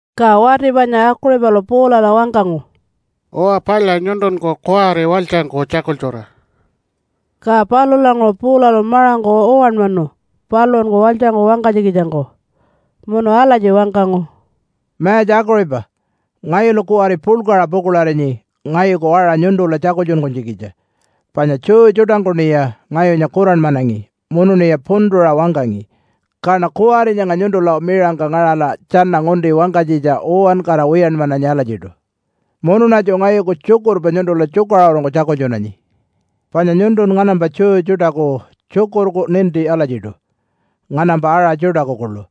Ka wati panya Akuṟipalu Paulala wangkangu, “Uwa palya, nyuntunku kuwari walytjangku tjakultjura!” Ka palulanguṟu Paulalu maṟangku uwanmanu paluṟunku walytjangku wangkanytjikitjangku, munu alatji wangkangu, “Mayatja Akuṟipa! Ngayulu kuwari puḻkaṟa pukuḻarinyi ngayuku aṟa nyuntula tjakultjunkunytjikitja, panya Jew tjuṯangkuṉiya ngayunya kuranmanangi munuṉiya puntuṟa wangkangi. Kaṉa kuwari nyanga nyuntula miṟangka ngaṟala tjana ngunti wangkanytjitja uwankara wiyanmananyi alatjiṯu munuṉatju ngayuku tjukurpa nyuntula tjukaṟurungku tjakultjunanyi. Panya nyuntun nganampa Jew tjuṯaku tjukurku ninti alatjiṯu nganampa aṟa tjuṯaku kuḻu.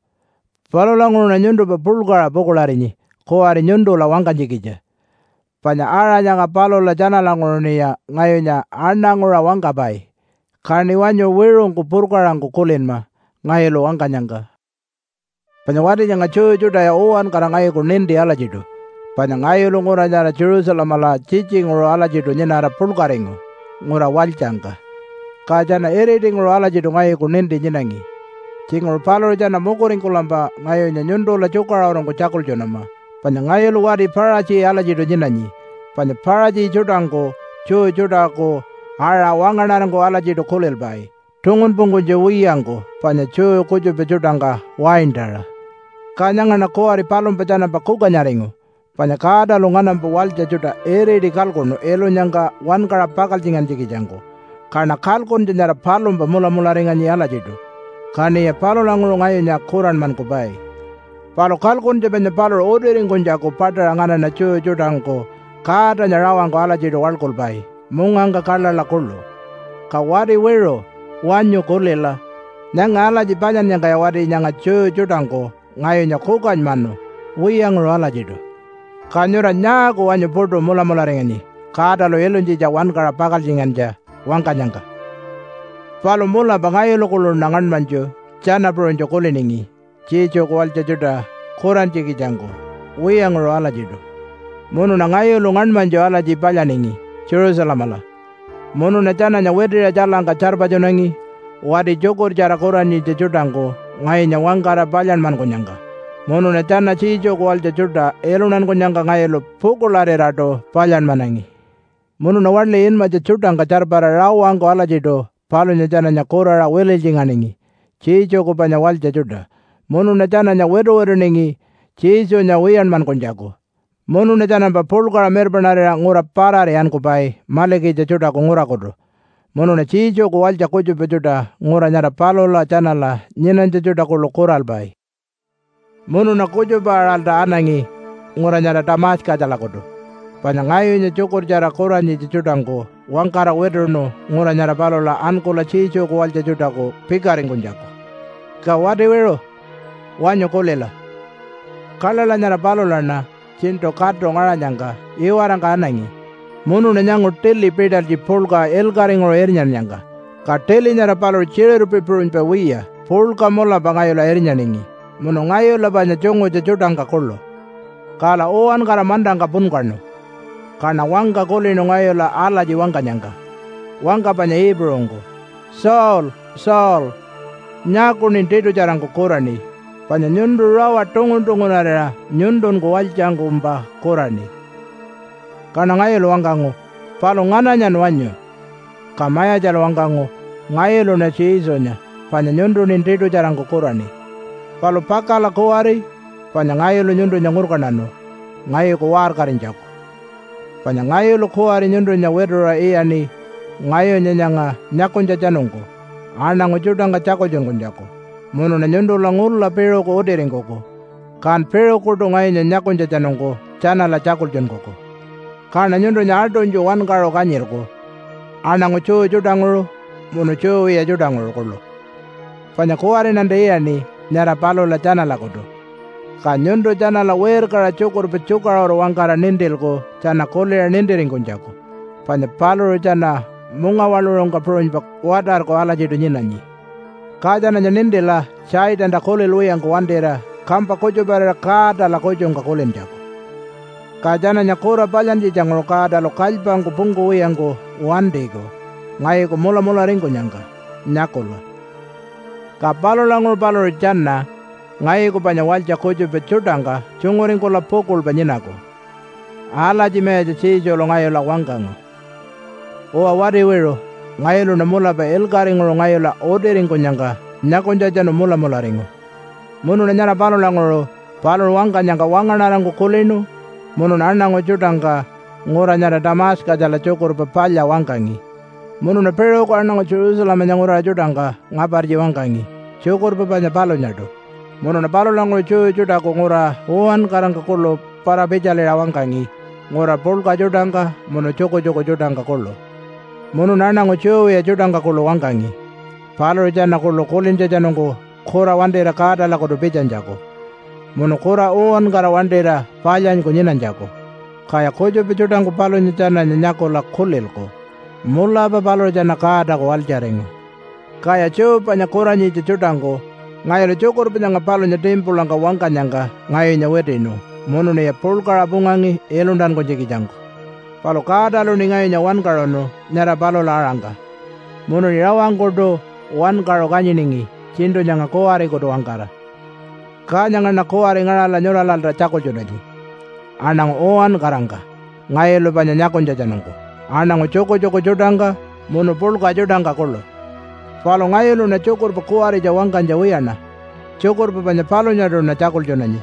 Palulanguṟuṉa nyuntumpa puḻkaṟa pukuḻarinyi kuwari nyuntula wangkanytjikitja. Panya aṟa nyanga palula tjanalanguṟuṉiya ngayunya aṉanguṟa wangkapai. Kaṉi wanyu wiṟungku purkaṟangku kulinma ngayulu wangkanyangka. “Panya wati nyanga Jew tjuṯaya uwankara ngayuku ninti alatjiṯu panya ngayulu ngura nyara Jerusalemala tjitjinguṟu alatjiṯu nyinara puḻkaringu ngura walytjangka. Ka tjana iritinguṟu alatjiṯu ngayuku ninti nyinangi. Tjinguṟu paluṟu tjana mukuringkulampa ngayunya nyuntula tjukaṟurungku tjakultjunama panya ngayulu wati Paṟatji alatjiṯu nyinanyi. Panya Paṟatji tjuṯangku Jew tjuṯaku aṟa wangaṉarangku alatjiṯu kulilpai tungunpungkunytja wiyangku panya Jew kutjupa tjuṯangka waintaṟa. Ka nyangaṉa kuwari palumpa tjanampa kukanyaringu, panya Godalu nganampa walytja tjuṯa iriti kalkuṉu ilunyangka wankaṟa pakaltjingantjikitjangku kaṉa kalkuntja nyara palumpa mulamularinganyi alatjiṯu, kaṉiya palulanguṟu ngayunya kuranmankupai. Palu kalkuntja panya paluṟu utiringkunytjaku paṯaṟa nganaṉa Jew tjuṯangku Godanya rawangku alatjiṯu waḻkulpai mungangka kaḻaḻa kuḻu. Ka wati wiṟu, wanyu kulila! Nyanga alatji palyannyangkaya wati nyanga Jew tjuṯangku ngayunya kukanymanu wiyanguṟu alatjiṯu. Ka nyura nyaaku wanyu puṯu mulamularinganyi Godalu ilunytjitja wankaṟa pakaltjingantja wangkanyangka? “Palu mulapa ngayulu kuḻuṉa ngaṉmanytju tjana puṟunytju kuliningi Jesuku walytja tjuṯa kurantjikitjangku wiyanguṟu alatjiṯu. Munuṉa ngayulu ngaṉmanytju alatji palyaningi Jerusalemala, munuṉa tjananya witiṟa tjailangka tjarpatjunangi wati tjukurtjara kuranyitja tjuṯangku ngayunya wangkara palyanmankunyangka. Munuṉa tjana Jesuku walytja tjuṯa iluntankunyangka ngayulu pukuḻariraṯu palyanmanangi. Munuṉa waḻi inmatja tjuṯangka tjarpara rawangku alatjiṯu palunya tjananya kuraṟa wililytjinganingi Jesuku panya walytja tjuṯa, munuṉa tjananya wituwituningi Jesunya wiyanmankunytjaku. Munuṉa tjanampa puḻkaṟa mirpaṉarira ngura parari ankupai malikitja tjuṯaku ngurakutu munuṉa Jesuku walytja kutjupa tjuṯa ngura nyara palula tjanala nyinanytja tjuṯa kuḻu kuralpai. “Munuṉa kutjupa-aṟalta anangi ngura nyara Tamatjakalakutu. Panya ngayunya tjukurtjara kuranyitja tjuṯangku wangkara wituṉu ngura nyara palula ankula Jesuku walytja tjuṯaku pikaringkunytjaku. Ka wati wiṟu, wanyu kulila! Kaḻaḻa nyara palulaṉa tjiṉṯu katu ngaṟanyangka iwarangka anangi, munuṉa nyangu tili pitalytji puḻka ilkaṟinguṟu irnyannyangka. Ka tili nyara paluṟu tjiṟirpi puṟunypa wiya puḻka mulapa ngayula irnyaningi munu ngayula panya tjungutja tjuṯangka kuḻu. Kala uwankara mantangka punkaṉu. Kaṉa wangka kulinu ngayula alatji wangkanyangka wangka panya Iipuṟungku, ‘Saul! Saul! Nyaakuṉin tiṯutjarangku kuraṉi? Panya nyuntu rawa tungun-tungunarira nyuntunku walytjangkumpa kuraṉi.’ “Kaṉa ngayulu wangkangu, ‘Palu ngananyan wanyu?’ “Ka Mayatjalu wangkangu, ‘Ngayuluṉa Jesunya, panya nyuntuṉin tiṯutjarangku kuraṉi. Palu pakala kuwari panya ngayulu nyuntunya ngurkantanu ngayuku waṟkarinytjaku, panya ngayulu kuwari nyuntunya wituṟa iyaṉi ngayunya nyanga nyakunytjatjanungku aṉangu tjuṯangka tjakultjunkunytjaku. Munuṉa nyuntula ngula piṟuku utiringkuku, kan piṟukuṯu ngayunya nyakunytjatjanungku tjanala tjakultjunkuku. Kaṉa nyuntunya aṯunytju wankaṟu kanyilku aṉangu Jew tjuṯanguṟu munu Jew wiya tjuṯanguṟu kuḻu. Panya kuwariṉanta iyaṉi nyara palula tjanalakutu, ka nyuntu tjanala wirkaṟa tjukurpa tjukaṟuru wangkara nintilku tjana kuliṟa nintiringkunytjaku, panya paluṟu tjana mungawaḻuṟungka puṟunypa watarku alatjiṯu nyinanyi. Ka tjananya nintila Satanta kulilwiyangku wantira kampa kutjuparira Godala kutjungka kulintjaku. Ka tjananya kura palyantjitjanguṟu Godalu kalypangku pungkuwiyangku wantiku ngayuku mulamularingkunyangka nyakula. Ka palulanguṟu paluṟu tjana ngayuku panya walytja kutjupa tjuṯangka tjunguringkula pukuḻpa nyinaku.’ Alatji Mayatja Jesulu ngayula wangkangu. “Uwa, wati wiṟu! Ngayuluṉa mulapa ilkaṟinguṟu ngayula utiringkunyangka nyakunytjatjanu mulamularingu. Munuṉa nyara palulanguṟu paluṟu wangkanyangka wangaṉarangku kulinu munuṉa aṉangu tjuṯangka ngura nyara Tamatjakala Tjukurpa Palya wangkangi. Munuṉa piṟuku aṉangu Jerusalemanya nguraṟa tjuṯangka ngapartji wangkangi tjukurpa panya palunyaṯu, munuṉa palulanguṟu Jew tjuṯaku ngura uwankarangka kuḻu para-pitjaliṟa wangkangi ngura puḻka tjuṯangka munu tjukutjuku tjuṯangka kuḻu. Munuṉa aṉangu Jew wiya tjuṯangka kuḻu wangkangi paluṟu tjana kuḻu kulintjatjanungku kura wantira Godalakutu pitjanytjaku, munu kura uwankara wantira palyanyku nyinanytjaku. Kaya kutjupa tjuṯangku palunya tjananya nyakula kulilku, ‘Mulapa paluṟu tjana Godaku walytjaringu.’ Kaya Jew panya kuranyitja tjuṯangku ngayulu tjukurpa nyanga palunya timpulangka wangkanyangka ngayunya witiṉu munuṉiya puḻkaṟa pungangi iluntankunytjikitjangku. Palu Godaluṉi ngayunya wankaṟunu nyara palula-aṟangka munuṉi rawangkuṯu wankaṟu kanyiningi tjiṉṯu nyanga kuwarikutu-wangkara. Ka nyangaṉa kuwari ngaṟala nyuralalta tjakultjunanyi aṉangu uwankarangka ngayulu panya nyakunytjatjanungku aṉangu tjukutjuku tjuṯangka munu puḻka tjuṯangka kuḻu. Palu ngayuluṉa tjukurpa kuwaritja wangkanytja wiyaṉa, tjukurpa panya palunyaṯuṉa tjakultjunanyi,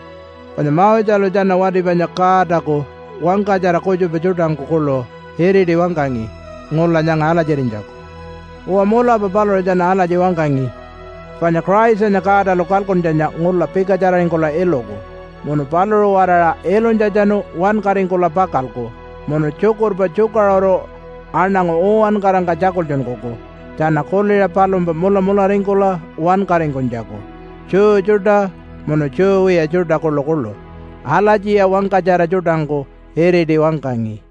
panya Moselu tjana wati panya Godaku wangkatjara kutjupa tjuṯangku kuḻu iriti wangkangi ngula nyanga alatjirinytjaku. Uwa, mulapa paluṟu tjana alatji wangkangi panya Christanya Godalu kalkuntjanya ngula pikatjararingkula iluku munu paluṟu-waraṟa ilunytjatjanu wankaringkula pakalku munu tjukurpa tjukaṟuru aṉangu uwankarangka tjakultjunkuku tjana kuliṟa palumpa mulamularingkula wankaringkunytjaku Jew tjuṯa munu Jew wiya tjuṯa kuḻukuḻu. Alatjiya wangkatjara tjuṯangku iriti wangkangi.”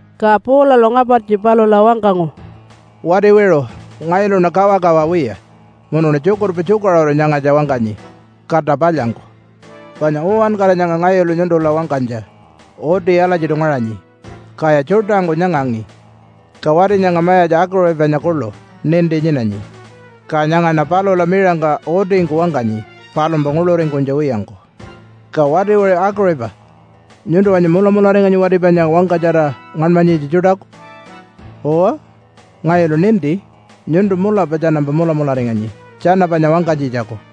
Ka Paulalu ngapartji palula wangkangu, “Wati wiṟu! Ngayuluṉa kawakawa wiya, munuṉa tjukurpa tjukaṟuru nyangatja wangkanyi kata palyangku. Panya uwankara nyanga ngayulu nyuntula wangkanytja uti alatjiṯu ngaṟanyi, kaya tjuṯangku nyangangi. Ka wati nyanga mayatja Akuṟipanya kuḻu ninti nyinanyi. Ka nyangaṉa palula miṟangka utingku wangkanyi palumpa nguḻuringkunytja wiyangku. Ka wati wiṟu Akuṟipa! Nyuntu wanyu mulamularinganyi wati panya wangkatjara ngaṉmanyitja tjuṯaku? Uwa, ngayulu ninti. Nyuntu mulapa tjanampa mulamularinganyi tjana panya wangkanytjitjaku.”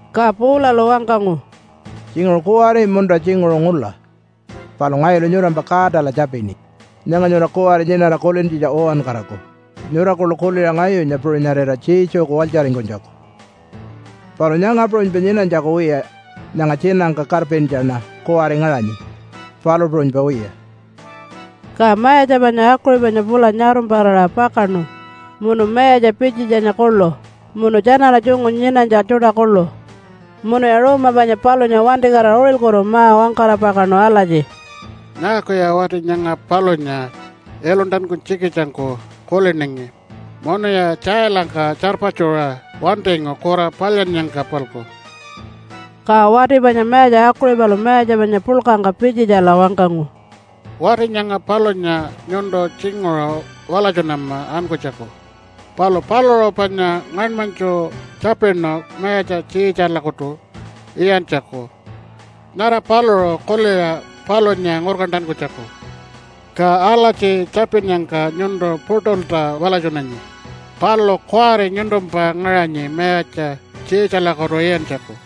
Ka Paulalu wangkangu, “Tjinguṟu kuwari munta tjinguṟu ngula, palu ngayulu nyurampa Godala tjapini nyanga nyura kuwari nyinara kulintjitja uwankaraku, nyura kuḻu kuliṟa ngayunya puṟunyarira Jesuku walytjaringkunytjaku, palu nyanga puṟunypa nyinanytjaku wiya nyanga tjiinangka karpintjaṉa kuwari ngaṟanyi, palu puṟunypa wiya.” Ka mayatja panya Akuṟipanya pula nyarumpara pakaṉu munu mayatja Pitjitjanya kuḻu munu tjanala tjungu nyinanytja tjuṯa kuḻu. Munuya ruuma panya palunya wantikatira uṟilkutu ma-wangkara pakaṉu alatji, “Nyaakuya wati nyanga palunya iluntankunytjikitjangku kuliningi munuya tjailangka tjarpatjuṟa wantingu kura palyannyangka-palku?” Ka wati panya mayatja Akuṟipalu mayatja panya puḻkangka Pitjitjala wangkangu, “Wati nyanga palunya nyuntu tjinguṟu walatjunama ankunytjaku, palu paluṟu panya ngaṉmanytju tjapinu mayatja Tjiitjalakutu iyantjaku nyara paluṟu kuliṟa palunya ngurkantankunytjaku. Ka alatji tjapinnyangka nyuntu puṯulta walatjunanyi, palu kuwari nyuntumpa ngaṟanyi mayatja Tjiitjalakutu iyantjaku.”